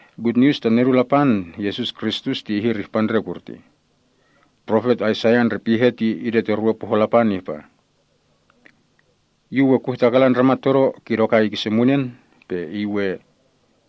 Gutnius ta Nedun Lapan, Yesus Kristus ti ihir ihpa ndre kurtih. Profet Aisaiah ndre pihe ti idetorwe pohon Lapan ihpa, “Yu we kuhtakalan ndramat todo kidokai kise munen, pe iy we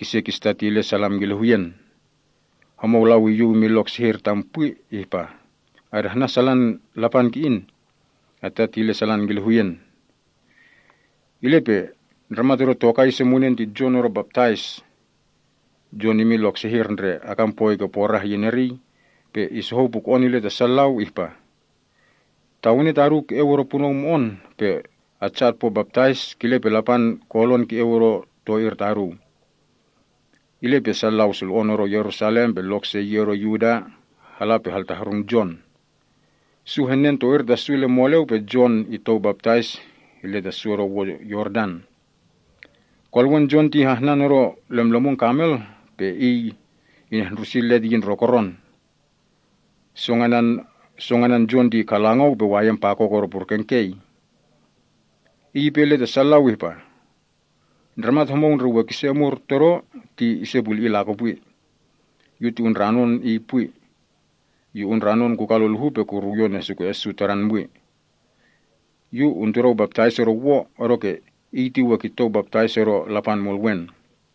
kise kisitatilen salam kile huyen. Homou lau iyuw imin lok sehir tam pwi, ihpa, ‘Adahnan salan Lapan ki‑in. Atatilen salan kile huyen.’” Ile pe ndramat odo tokai ise munen ti Jon odo Baptais. Jon imin lok sehir ndre akan poi ke porah iyin eriy, pe isohou puko‑on ile ta sa lau ihpa, “Tawene taduu ke‑eu odo punou mo‑on pe atsa otpo baptais, kile pe Lapan kolon ke‑eu odo to‑ir taduu.” Ile pe sa lau sulo‑on odo Yerusalem pe lok se yi odo Yuda, hala pe haltahrung Jon. Su henen to‑ir ta su ile moleu pe Jon itou baptais ile ta su odo wo Yordan. Kolewen Jon ti hahnan odo lemlemun kamel, pe iy inehndrusi let iyin ndrokoron. Song anan Jon ti kalangou pe wayen pakok odo purken kei. Iy ipe ile ta sa lau ihpah, “Ndramat homou ndre we kise omur todo ti ise puli‑i lakopwi. Yu ti undranon Iy pwi. Yu undranon kukaluluhu pe kuruwyon esuke‑en su Tadan pwi. Yu untudou baptais odo wo, odoke Iy ti we kitou baptais odo Lapan Mulwen.”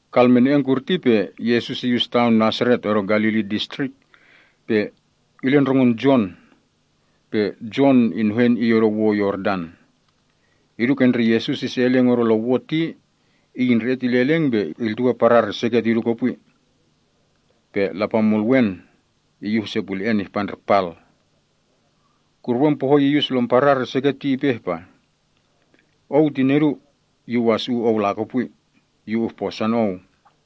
Kalmene‑en kurti pe Yesus iyus taon Nasaret, odo Galili Distrik, pe ile ndrongon Jon. Pe Jon inuhen Iy odo wo Yordan. Idu ke ndre Yesus ise eleng odo lon wo ti, Iy indre‑et ile eleng, pe iltuwe parar iseket idu kopwi. Pe Lapan Mulwen iyuh ise pule‑en ihpa ndre pal. Kuruwen pohoi iyus lom parar iseket ti ipe ihpa, “Ou ti Nedu. Yu wasu‑u Ou lakopwi. Yu uhposon Ou.”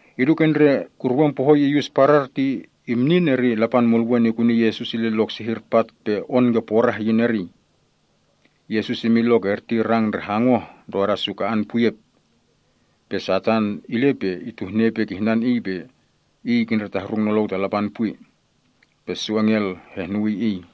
Idu ke ndre kuruwen pohoi iyus parar ti imnin, eri Lapan Mulwen ikuni Yesus ile lok sehir, pat pe on ke porah iyin eriy. Yesus imin lok erti rang ndre hangoh ndroda su ka‑an puyep. Pe Satan ile pe ituhne ipe kihnan Iy pe Iy kindretahrung nolou ta Lapan pwi. Pe su engel henehnuwii Iy.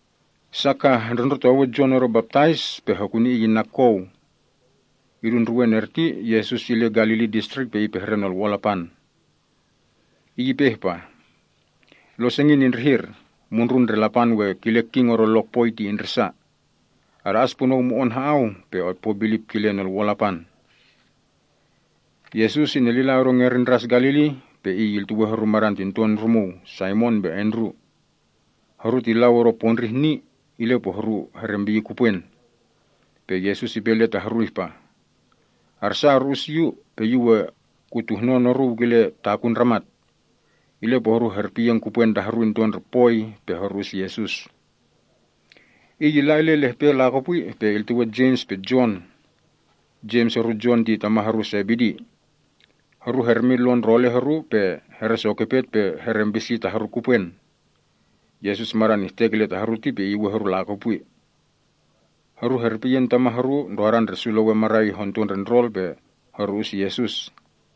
Sa kah hendrundrotowe Jon odo Baptais pe hokuni iy inna kou. Idu ndruwen erti, Yesus ile Galili Distrik pe ipehre Nolwo‑on Lapan. Iy ipe ihpa, “Losengin indrihir. Mundrun ndre Lapan we kile king odo lokpoi ti indrisa. Ada‑as punou mo‑on ha‑au pe otpo bilip kile Nolwo‑on Lapan.” Yesus inelila odo ngerin Ndras Galili, pe Iy iltuwe horu madan tinton rumuu, Saimon pe Andru. Horu ti lau odo pondrih ni, ile pe horu herempiyi kupwen. Pe Yesus ipe ile ta horu ihpa, “Arsa oru‑us Yu, pe Yu we kutuhnon oruu kile takun ndramat.” Ile pe horu herpiyen kupwen ta horu into ndre poi pe horu‑us Yesus. Iy illa ile lehpe lakopwi, pe iltuwe Jems pe Jon. Jems horu Jon ti tama’ horu Sebedi. Horu hermin lon ndrole’ horu, pe heresokopet pe herempisi ta horu kupwen. Yesus madan ihtek ta horu ti pe iyuwen horu lakopwi. Horu herpiyen tama’ horu ndrodan ndre su lewen marai honto ndre ndrol, pe horu‑us Yesus.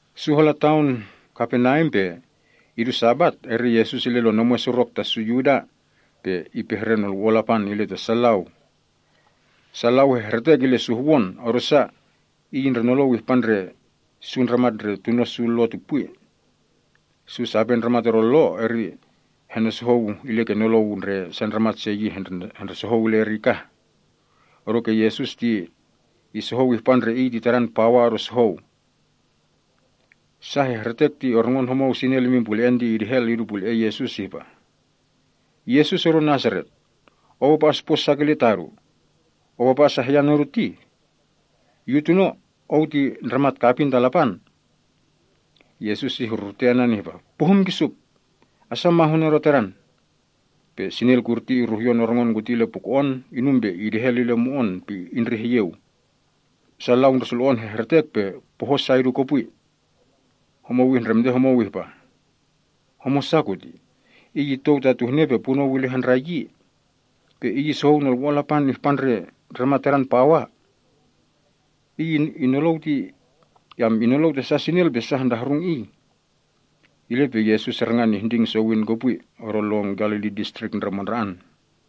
Su hala taon Kaperneam, pe idu Sabat, eri Yesus ile lon omwen surok ta su Yuda pe ipehre nolwo‑on Lapan ile ta sa lau. Sa lau hehretek ile suhwon, odosa Iy indrenolou ihpa ndre su ndramat ndre tuno’ su Lo ti pwi. Su sape ndramat odo Lo ti henosohou illa ke nolou ndre sa ndramat se yi hendresohou kah ile eri, odoke Yesus ti isohou ihpa ndre Iy ti Tadan pawa odo sohou. Sa hehretek ti orngon homou sinel imin pule‑en ti idehel idu pule‑en Yesus ihpa, “Yesus odo Nasaret, Ou apa ospo sa kile tadu? Ou apa asahyan odu tih? Yu tuno Ou! Ou ti Ndramat Kapin ta Lapan!” Yesus ihrurute anan ihpa, “Onlou kah! Asa mahun odo tadan!” Pe sinel kuti iruhyon orngon kuti ile puko‑on, inum pe idehel ile mo‑on pe indreh iyeu. Sa lau ndre sulo‑on hehretek pe poho’ sa idohoh idu kopwi. Homou ihndremte homou ihpa, “Homosa kutih? Iy itou tatuhne pe punou ile handrai yi. Iy isohou Nolwo‑on Lapan ihpa ndre ndramat tadan pawa. Pe inlou ta sa sinel pe su hohrung Iy!” Ile pe Yesus rangan ihnding sowin kopwi odo lon Galili Distrik ndre mandra‑an.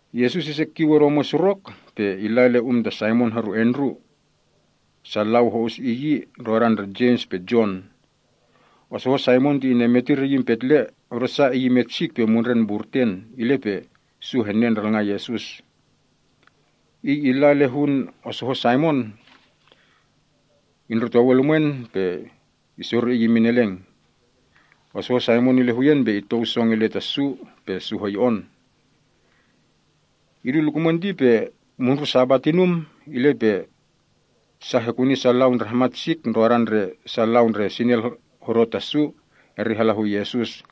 Yesus ise kiu odo omwen surok pe illa ile um ta Saimon horu Andru. Sa lau se ho‑us yi, ndrodan ndre Jems pe Jon. Osohon Saimon ti inemetir iyin petle odosa iy imet sik pe mundren mburten, ile pe su henen ndralngan Yesus. Iy illa ile hun osohon Saimon, indrotowe lumwen, pe isori iy imin eleng. Osohon Saimon ile huyen, pe itou song ile ta su pe su hoyo‑on. Idu lukumwen ti pe mundrun Sabat inum. Ile pe sa hekuni sa lau ndre hamat sik, ndrodan ndre sa lau ndre sinel hodo ta su, eri hala hu Yesus.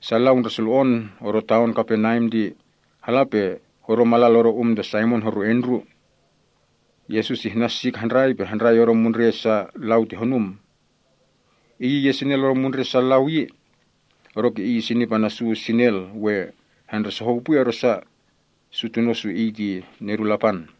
Sa lau ndre sulo‑on odo taon Kaperneam ti hala pe hodo malal odo um ta Saimon horu Andru. Yesus ihnan sik handrai pe handrai odo mundre’ sa lau ti honum. Iy iyes sinel odo mundre’ sa lau yi. Odoke Iy isinip ana’ su sinel we hendresohou pwi, odosa, su tuno’ su Iy ti Nedun Lapan.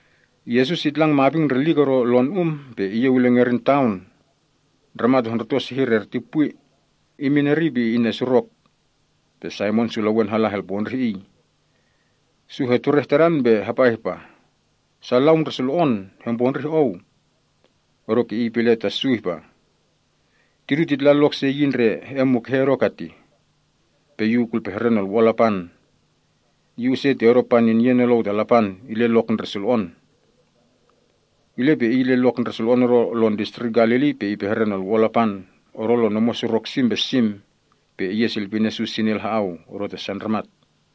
Yesus itlang maping ndrelik odo lon um, pe iyeu ile ngerin taon. Ndramat hondruto sehir erti pwi. Iy imin eriy pe inesurok. Saimon su lewen hala helpondrih Iy. Su hetureh Tadan pe hapa ihpa, “Sa lau ndre sulo‑on hempondrih Ou.” Odoke Iy ipe ile ta su ihpa, “Tidu titla lok se yi ndre he‑en mukehe odo ketih, pe Yu kulpehre Nolwo‑on Lapan. Yu use ti odo paninye nolou ta Lapan ile lok ndre sulo‑on.” Ile pe Iy ile lok ndre sulo‑on odo lon distrik Galili pe ipehre Nolwo‑on Lapan odo lon omwen surok sim pe sim, pe iyesilpinen su sinel ha‑au odo ta sa ndramat.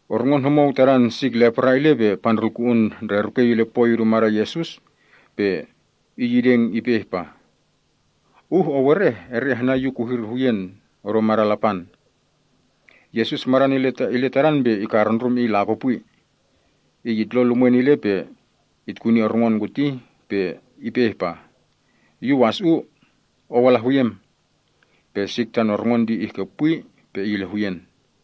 Orngon homou tadan sik lepra ile, pe pandrulku‑un ndre rukei ile poi idu madan Yesus, pe iy ideng ipe ihpa, “Uh Ou ereh, eri ahnan yu kuhir huyen odo madan Lapan.” Yesus madan ile tadan pe ikarndrum iy lakopwi. Iy itlon lumwen ile pe itkuni orngon kuti, pe ipe ihpa, “Yu wasu‑u. Ou ala huyem.” Pe sik tan orngon ti ihkepwi pe iy ile huyen.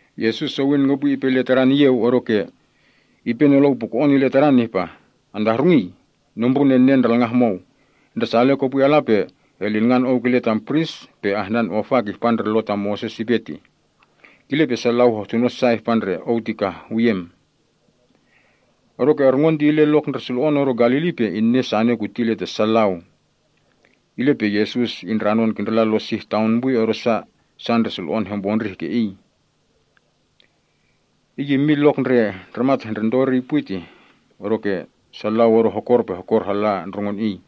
Yesus sowin kopwi ipe ile tadan iyeu, odoke ipe nolou puko‑on ile tadan ihpa, “Antahrungii? Nombrun enen ndralngan homou. Ndresale kopwi ala pe elilngan ou kile tam pris, pe ahnan ofa kihpa ndre Lo ta Moses ipe tih. Kile pe sa lau hehtuno sa ihpa ndre ou ti kah huyem.” Odoke orngon ti ile lok ndre sulo‑on odo Galili pe inen sane kuti ile ta sa lau. Ile pe Yesus indranon kindrila lon sih taon pwi, odosa sa ndre sulo‑on hempondrih ke Iy. Iy immin ke lok ndre ndramat hondruto eriy pwi ti, odoke sa lau odo hokor pe hokor halla ndrongon Iy.